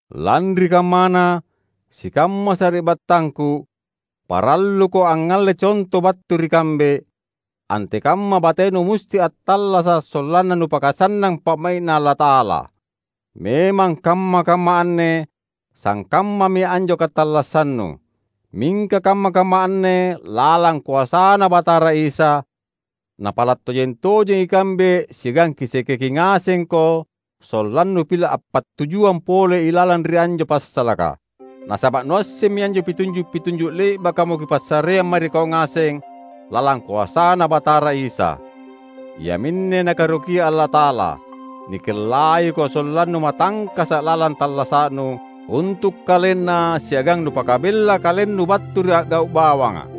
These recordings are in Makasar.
Lanri kammana, sikamma sari’battangku, paralluko angngalle conto battu ri kambe, antekamma batenu musti attallasa’ sollanna nupakasannang pa’mai’Na Allata’ala. Memang kamma-kamma anne sangkammami anjo katallassannu. Mingka kamma-kamma anne lalang koasaNa Batara Isa, napala’ tojeng-tojengi ikambe siagang kisekeki ngasengko sollannu pila’ appattujuang pole ilalang ri anjo passalaka! Nasaba’ nuassemmi anjo pitunju’-pitunju’ le’bakamo kipassareang mae ri kau ngaseng lalang koasaNa Batara Isa. Iaminne Nakaerokia Allata’ala: Nikellaiko sollannu matangkasa’ lalang tallasa’nu, untu’ KalenNa siagang nupakabella kalennu battu ri a’gau’ bawanga.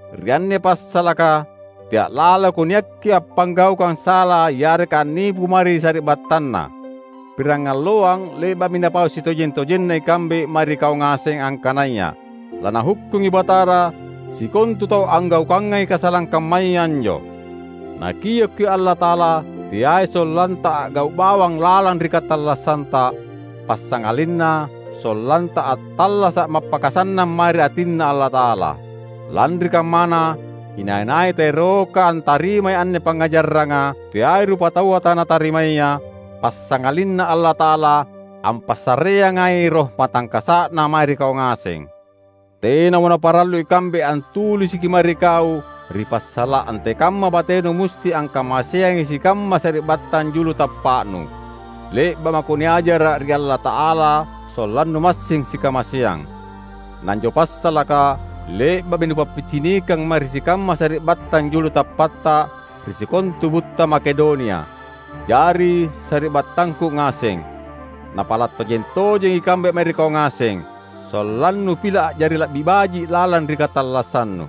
Ri anne passalaka, tea’ laloko niakki appanggaukang sala yareka annipu mae ri sari’battanna. Pirangalloang le’ba’mi napau sitojeng-tojenna ikambe mae ri kau ngaseng angkanaya laNahukkungi Batara sikontu tau anggaukangai kasalang kammaya anjo. Nakiokki’ Allata’ala, teai sollanta a’gau’ bawang lalang ri katallassanta, passangalinna sollanta attallasa’ mappakasannang mae ri atinNa Allata’ala. Lanri kammana, inai-nai taeroka antarimai anne pangngajaranga, teai rupataua tanatarimaya, passangalinna Allata’ala ampassareangai Roh matangkasa’Na mae ri kau ngaseng. Tenamo naparallu ikambe antulisiki mae ri kau ri passala’ antekamma batenu musti angkamaseangi sikamma sari’battang julu tappa’nu. Le’ba’ mako niajara’ ri Allata’ala sollannu massing sikamaseang. Na anjo passalaka le’ba’mi nupappicinikang mae ri sikamma sari’battang julu tappatta ri sikontu butta Makedonia. Jari, sari’battangku ngaseng, napala’ tojeng-tojengi ikambe mae ri kau ngaseng, sollannu pila’ a’jari la’bi baji’ lalang ri katallassannu.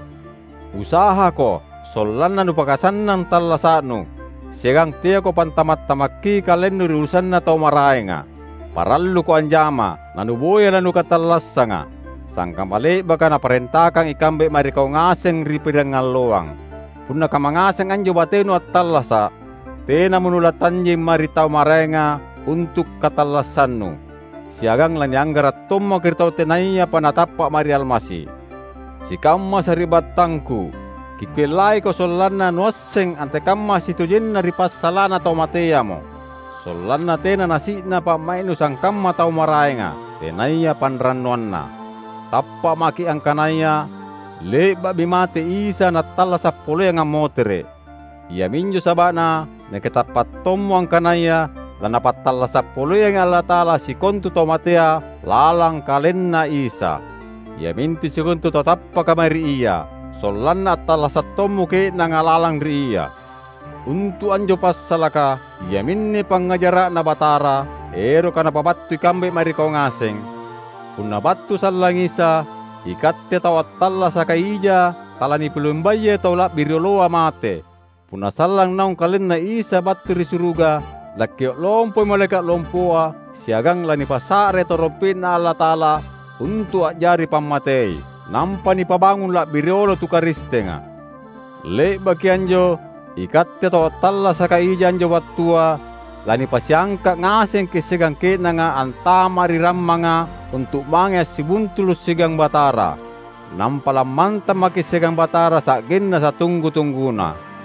Usahako sollanna nupakasannang tallasa’nu, siagang teako pantama’-tamakki kalennu ri urusanna tau maraenga. Paralluko anjama, nanuboya lanukatallassanga, sangkamma le’baka naparentakang ikambe mae ri kau ngaseng ri pirangalloang. Punna kamma ngaseng anjo batenu attallasa’, tenamo nulatanjeng mae ri tau maraenga untu’ katallassannu; siagang lanianggara’ tommako ri tau tenayapa natappa’ mae ri Almasi. Sikamma sari’battangku; kikellaiko sollanna nuasseng antekamma sitojenna ri passala’na tau mateamo; sollanna tena nasi’na pa’mai’nu sangkamma tau maraenga, tenaya panrannuanna. Tappa’ maki’ angkanaya le’ba’mi mate Isa Nattallasa’ poleang ammotere’. Iaminjo saba’na nakitappa’ tommo angkanaya laNapattallasa’ poleangi Allata’ala sikontu tau matea lalang KalenNa Isa, iamintu sikontu tau tappaka mae ri Ia, sollanna attallasa’ tommo ke’nanga lalang ri Ia. Untu’ anjo passalaka, iaminne pangngajara’Na Batara, eroka napabattu ikambe mae ri kau ngaseng: Punna battu sallang Isa, ikatte tau attallasaka ija talanipilumbayai tau la’bi rioloa mate. Punna sallang naung KalenNa Isa battu ri suruga, lakkio’ lompoi malaeka’ lompoa siagang lanipasa’rai tarompe’Na Allata’ala untu’ a’jari pammatei. Nampa nipabangung la’bi riolo tu Karistenga. Le’baki anjo, ikatte tau attallasaka ija anjo wattua lanipasiangka’ ngasengki’ siagang ke’nanga antama’ ri rammanga untu’ mange assibuntulu’ siagang Batara. Nampa lammantang maki’ siagang Batara sa’genna satunggu-tungguna.